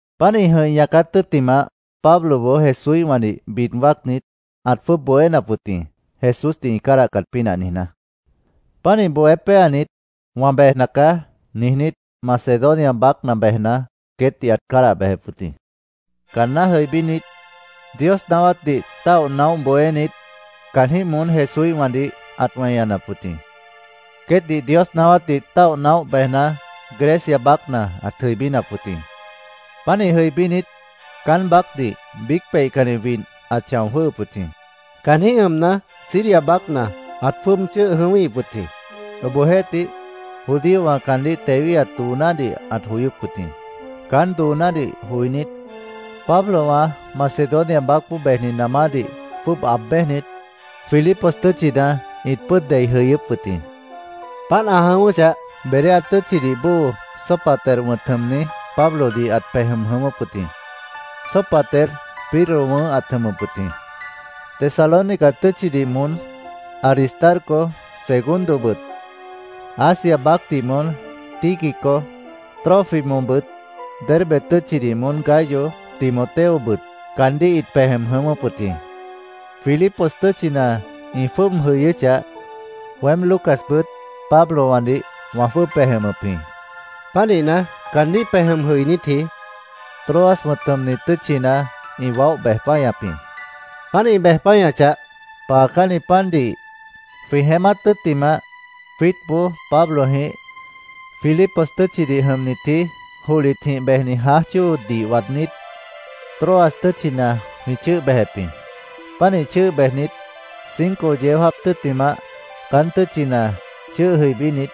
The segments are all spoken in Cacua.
Páant ĩ jʉ̃ih ñaác yayát tʉ́ttimah, Pabloboó Jesúíhwãdih bid wáacnit, ãt jwʉ́ʉb bohénap wʉt jĩ, Jesúsdih ĩ cádahcat pínah niijná. Pánih bohé péanit, “Wã bejna caá”, niijnít, Macedonia baácna bejna, queétdih ãt cádah bejep wʉt jĩ. Caanná jʉibínit, Dios naáwátdih táoh naóh bohénit, caanjĩ́h moón Jesúíhwãdih ãt weñanap wʉt jĩ. Queétdih Dios naáwátdih táoh naóh bejna, Grecia baácna ãt jʉibínap wʉt jĩ. Pánih jʉibínit, caán baácdih biíc peihcanni widh ãt chão jwʉ́hʉp wʉt jĩ. Caanjĩ́h jʉmna, Siria baácna ãt jwʉ́ʉb chʉ́ʉh jʉ̃ʉ́wíhip wʉt jĩ. Obohjeéhtih, judíowã caandíh tewíhat doonádih ãt joyóp wʉt jĩ. Caán doonádih joinít, Pablowã Macedonia baácboó bejni namádih jwʉ́ʉb aáb bejnit, Filipos tʉ́tchina ĩt pʉ́ʉd dei jʉyʉ́p wʉt jĩ. Páant ã jʉ̃ʉ́wʉ́chah, Berea tʉ́tchidih bóo, Sópater wʉ̃t jʉmni Pablodih ãt pej jʉm jʉ̃ʉ́wʉ́p wʉt jĩ. Sópater Pirro wʉ̃ʉ́h ãt jʉmʉp wʉt jĩ. Tesalónica tʉ́tchidih moón Aristarco, Segundobʉt, Asia baácdih moón Tíquico, Trófimobʉt, Derbe tʉ́tchidih moón Gayo, Timoteobʉt caandíh ĩt pej jʉm jʉ̃ʉ́wʉ́p wʉt jĩ. Filipos tʉ́tchina ĩ jwʉ́ʉb jʉyʉ́chah, weém Lucasbʉt Pablowãdih wã jwʉ́ʉb pej jʉmʉp jĩ. Pánihna, caandíh pej jʉm jʉinítji, Troas wʉ̃t jʉmni tʉ́tchina ĩ waóh bej páñap jĩ. Páant ĩ bej páñachah, paacánni pandih jwĩ jeémát tʉ́ttimah, jwiítboó Pablojĩh Filipos tʉ́tchidih jʉmnitji, johlitjĩh bejni jãáj chóodih waadnít, Troas tʉ́tchina jwĩ chʉ́ʉh bejep jĩ. Pánih chʉ́ʉh bejnit, cinco yeó jáap tʉ́ttimah, caán tʉ́tchina chʉ́ʉh jʉibínit,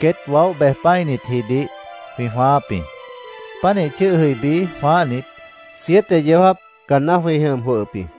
queét waóh bej pã́initjidih jwĩ jwãááp jĩ. Pánih chʉ́ʉh jʉibí jwãáhnit, siete yeó jáap caanná jwĩ jʉm jwʉhʉp jĩ.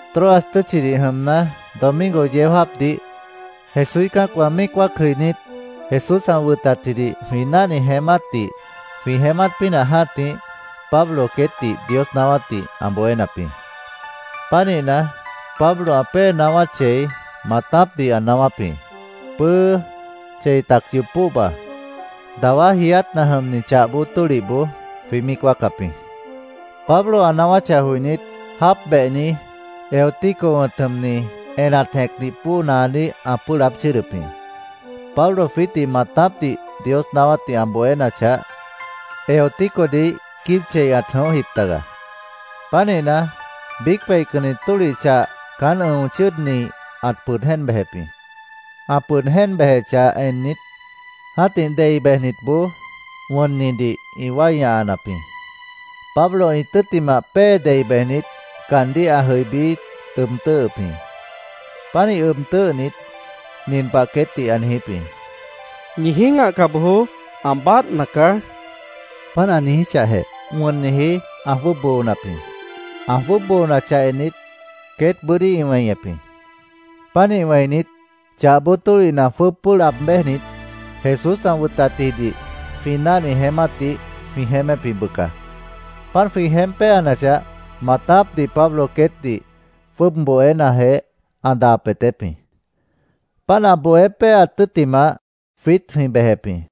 Troas tʉ́tchidih jʉmna, domingo yeó jáapdih Jesúíh cã́acwã míic wáac jʉinít, Jesús ã wʉnatjidih jwĩ náhni jeémátdih jwĩ jeémát pínah jã́tih, Pablo queétdih Dios naáwátdih ã bohénap jĩ. Pánihna, Pablo ã pée naáwát chei, maatápdih ã naáwáp jĩ, pʉ́ʉ́ chei tac yoob póhba. Dawá jiiátna jʉmni chah bóo tólihboó jwĩ míic wáacap jĩ. Pablo ã naáwáchah joinít, jáap behni, Eutico wʉ̃t jʉmni, enat jẽcdih bóo naadíh ã pʉ́ʉh laáb chʉ́ʉdʉp jĩ. Pablo jwiítdih maatápdih Dios naáwátdih ã bohénachah, Euticodih quíib chei ãt jʉ̃óhjip taga. Pánihna, biíc peihcanni tólih chah caán ʉ̃o chʉ́ʉdni ãt pʉd jéen bejep jĩ. Ã pʉd jéen bejechah ennit, jã́tih dei bejnitboó wʉnnidih ĩ wái ñahanap jĩ. Pablo ĩ tʉ́ttimah pée dei bejnit, caandíh ã jʉibí ʉb tʉ́ʉhʉp jĩ. Pánih ʉb tʉ́ʉhnit, nin pah queétdih ã niijíp jĩ: —Ñi jĩ́gahca bojoó. Ã báadhna caá, ã niijíp jĩ. Páant ã niijíchahjeh, wʉnniji ã jwʉ́ʉb boonap jĩ. Ã jwʉ́ʉb boonachah ennit, queétboó bʉ́dí ĩ weñep jĩ. Pánih wẽinit, chah bóo tólihna jwʉ́ʉb pʉ́ʉh laab béjnit, Jesús ã wʉnatjidih jwĩ náhni jeémátdih jwĩ jeémép jĩ, bʉca. Páant jwĩ jeémp péanachah, maatápdih Pablo queétdih jwʉ́ʉb bohénajeh, ã daa peetép jĩ. Páant ã bohé péaat tʉ́ttimah, jwiít jwĩ bejep jĩ.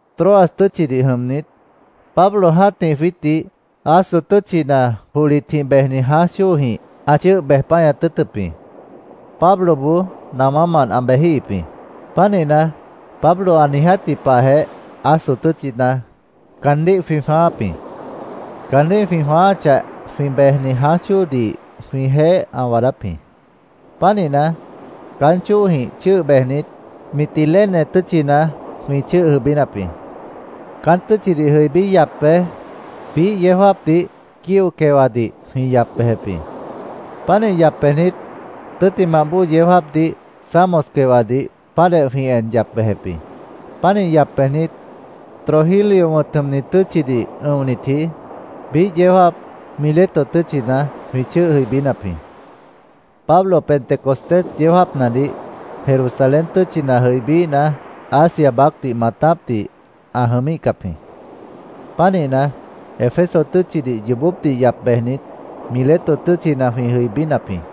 Troas tʉ́tchidih jʉmnit, Pablo jã́tih jwiítdih Aso tʉ́tchina johlitjĩh bejni jãáj chóojĩh ã chʉ́ʉh bej páñat tʉ́ʉtʉp jĩ. Pabloboó namámant ã bejíhip jĩ. Pánihna, Pablo ã niijátji pahjeh Aso tʉ́tchina caandíh jwĩ jwãááp jĩ. Caandíh jwĩ jwãááchah, jwĩ bejni jãáj chóodih jwĩjeéh ã waadáp jĩ. Pánihna, caán chóojĩh chʉ́ʉh bejnit, Mitilene tʉ́tchina jwĩ chʉ́ʉh jʉibínap jĩ. Caán tʉ́tchidih jʉibí yap bej, biíh yeó jáapdih Quío quewadih jwĩ yap bejep jĩ. Pánih yap bejnit, tʉ́ttimah bóo yeó jáapdih Samos quewadih páantjeh jwĩ en yap bejep jĩ. Pánih yap bejnit, Trogilio wʉ̃t jʉmni tʉ́tchidih ʉ̃onitji biíh yeó jáap Mileto tʉ́tchina jwĩ chʉ́ʉh jʉibínap jĩ. Pablo Pentecostés yeó jáapnadih Jerusalén tʉ́tchina jʉibííhna, Asia baácdih maatápdih ã jʉmíhcap jĩ. Pánihna, Éfeso tʉ́tchidih yoobópdih yap bejnit, Mileto tʉ́tchina jwĩ jʉibínap jĩ.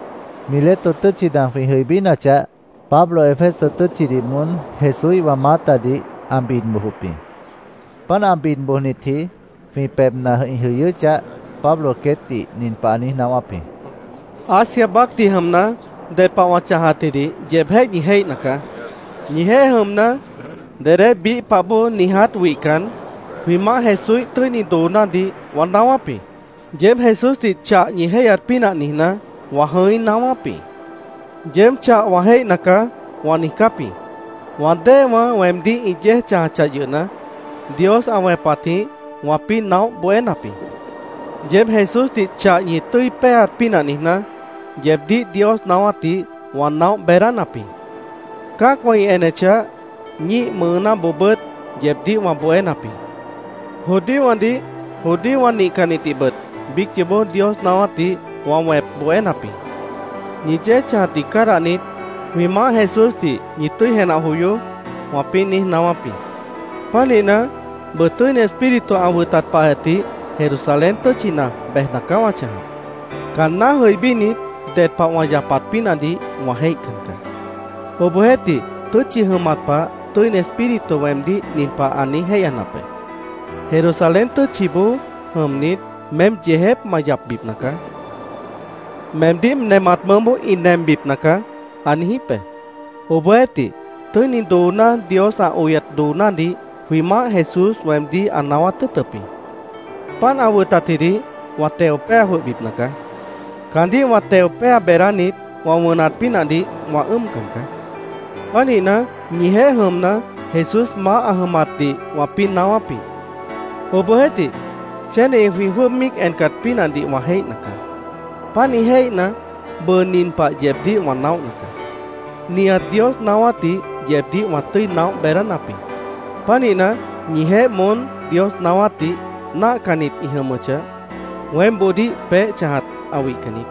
Mileto tʉ́tchina jwĩ jʉibínachah, Pablo Éfeso tʉ́tchidih moón Jesúíhwã maátadih ã bid bojop jĩ. Páant ã bid bojnitji jwĩ pebhna ĩ jʉyʉ́chah, Pablo queétdih nin pah ã niíj naáwáp jĩ: “Asia baácdih jʉmna, ded pah wã chãjatjidih yeebjéh ñi jéihna caá. Ñijeéh jʉmna, dedé biíh pah bóo niiját wihcan, jwĩ Maáh Jesúíh tʉ́ini doonádih wã naáwáp jĩ. Yeéb Jesúsdih chah ñi jéihyat pínah niijná, wã jʉ̃í naáwáp jĩ. ‘Yeéb chah wã jéihna caá’, wã niijcáp jĩ. Wã déewã weemdíh ĩ yéej chãjachah yʉhna, Dios ã wẽpatjĩh wãpĩ́ naóh bohénap jĩ. Yeéb Jesúsdih chah ñi tʉ́i péeat pínah niijná, yeebdíh Dios naáwátdih wã naóh beedánap jĩ. Cã́acwã ĩ enechah, ñíih mʉʉnáboobʉ́t yeebdíh wã bohénap jĩ. Judíowãdih, judíowã nihcannitdihbʉt biíc yoobó Dios naáwátdih wã wẽp bohénap jĩ. ‘Ñi yéej chãjatdih cádahnit, jwĩ Maáh Jesúsdih ñi tʉ́i jenah joyoó’, wãpĩ́ niíj naáwáp jĩ. Pánihna, bʉʉ Tʉ́ini Espíritu ã wʉtat pahjeh tih Jerusalén tʉ́tchina bejna caá wã chãjap. Caanná jʉibínit, ded pah wã yapat pínahdih wã jéihcan caá. Obohjeéhtih, tʉ́tchi jʉmat pah Tʉ́ini Espíritu weemdíh nin pah ã niíj jéihyanap be: ‘Jerusalén tʉ́tchiboó jʉmnit, meém yeejép ma yapbipna caá. Meemdíh nemat mʉʉ́boó ĩ nembipna caá’, ã niijíp be. Obohjeéhtih, tʉ́ini dooná, Dios ã oyat doonádih jwĩ Maáh Jesús weemdíh ã naáwát tʉ́ʉtʉp jĩ. Páant ã wʉtatjidih wã teo péa jwʉhbipna caá. Caandíh wã teo péa beedánit, wã wʉnat pínahdih wã ʉ́ʉmcan caá. “Pánihna, ñijeéh jʉmna, Jesús maáh ã jʉmatdih wãpĩ́ naáwáp jĩ. Obohjeéhtih, chéneji jwĩ jwʉ́ʉb míic encat pínahdih wã jéihna caá. Pánih jéihna, bʉʉ nin pah yeebdíh wã naóhna caá: Nihat Dios naáwátdih yeebdíh wã tʉ́i naóh beedánap jĩ. Pánihna, ñijeéh moón Dios naáwátdih náahcannit ĩ jʉmʉchah, weémboodíh peéh chãjat ã wihcan niít.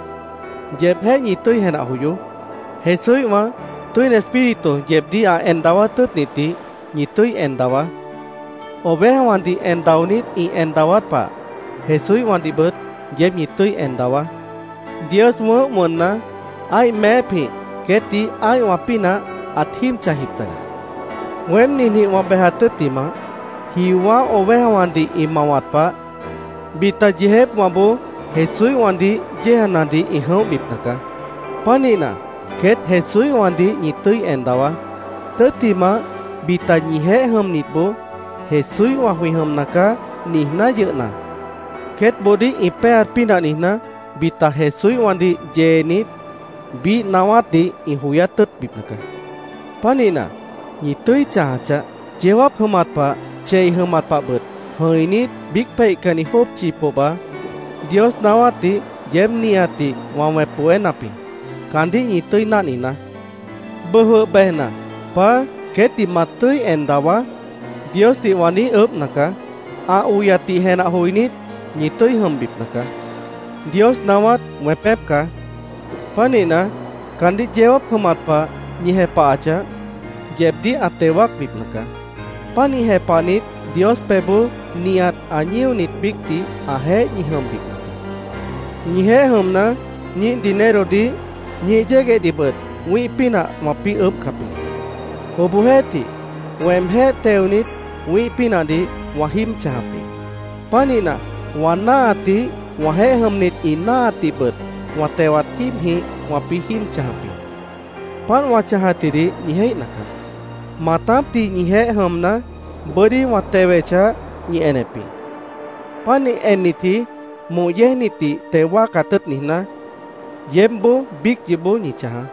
Yeebjéh ñi tʉ́i jenah joyoó. Jesúíhwã Tʉ́ini Espíritu yeebdíh ã en daawát tʉ́ʉtnitdih ñi tʉ́i en dawaá. Ovejawãdih en daonít ĩ en dawát pah Jesúíhwãdihbʉt yeéb ñi tʉ́i en dawaá. Dios wʉ̃ʉ́h wʉnna, ã́ih meépjĩh queétdih ã́ihwã pínah ãt jíib chãjjip taga. Weém ninjĩh wã bejat tʉ́ttimah, jiowã́ ovejawãdih ĩ mawat pah, bita yeejépwãboó Jesúíhwãdih yéejanadih ĩ jʉ̃óhbipna caá. Pánihna, queét Jesúíhwãdih ñi tʉ́i en dawaá. Tʉ́ttimah, bita ñijeéh jʉmnitboó ‘Jesúíhwã jwĩ jʉmna caá’, niijná yʉhna, queétboodíh ĩ péeat pínah niijná, bita Jesúíhwãdih yeenit, biíh naáwátdih ĩ joyát tʉ́ʉtbipna caá. Pánihna, ¡ñi tʉ́i chãja chaáh! Yeó jáap jʉmat pah, chei jʉmat pahbʉt jʉ̃inít, biíc peihcanni jópchi pohba, Dios naáwátdih yeéb nihatdih, wã wẽp bohénap jĩ. Caandíh ñi tʉ́i náhninaá. “Bʉʉ jwʉh bejna, ‘Paá, queétdih ma tʉ́i en dawaá’, Diosdih wã niíj ʉʉ́bhna caá. Ã oyatdih jenah joinít, ñi tʉ́i jʉmbipna caá. Dios naáwát wẽpép caá. Pánihna, caandíh yeó jáap jʉmat pah ñi jepahachah, yeebdíh ã teo wáacbipna caá. Pánih jepahnit, Dios pebhboó nihat ã ñíonit biícdih ãjeéh ñi jʉmbipna caá. Ñijeéh jʉmna, ñíih dinerodih, ñíih yéguehdihbʉt wĩ́ih pínah wãpĩ́ ʉʉ́bhcap jĩ. Obohjeéhtih, weemjéh teonit, wĩ́ih pínahdih wã jíib chãjap jĩ. Pánihna, wã náahatdih, wãjeéh jʉmnit ĩ náahatdihbʉt wã tewat jíibjĩh wãpĩ́ jíib chãjap jĩ. Páant wã chãjatjidih ñi jéihna caá. Maatápdih ñijeéh jʉmna, bʉ́dí wã tewechah, ñi enep jĩ. Pánih ennitji moh yéejnitdih teo wáacat tʉ́ʉt niijná, yeebbʉ́t biíc yoobó ñi chãjaá.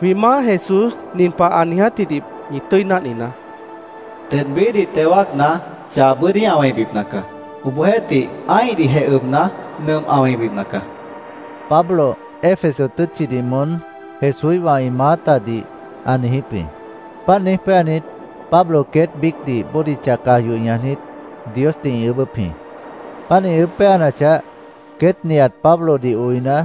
Jwĩ Maáh Jesús nin pah ã niijátjidih ñi tʉ́i náhninaá: ‘Ded biíhdih teo wáacna, chah bʉ́dí ã wẽibipna caá. Obohjeéhtih, ã́ihdihjeh ʉbna, nʉmp ã wẽibipna caá’, ãt niijíp wʉt jĩ”, Pablo Éfeso tʉ́tchidih moón Jesúíhwã ĩ maátadih ã niijíp jĩ. Páant niíj péanit, Pablo queét biícdih bódicha caj yoh ñajnit, Diosdih ĩ ʉʉ́bʉ́p jĩ. Páant ĩ ʉʉ́bh péanachah, queét nihat Pablodih oina,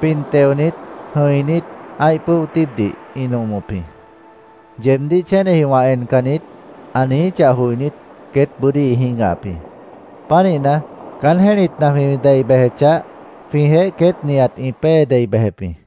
pin teonit, jʉ̃inít, ã́ih pʉ́o tíibdih ĩ nomop jĩ. “Yeebdíh chéneji wã encan niít”, ã niijíchah joinít, queét bʉ́dí ĩ jĩ́gahap jĩ. Pánihna, caán jẽ́litna jwĩ dei bejechah, jwĩjeéh queét nihat ĩ pée dei bejep jĩ.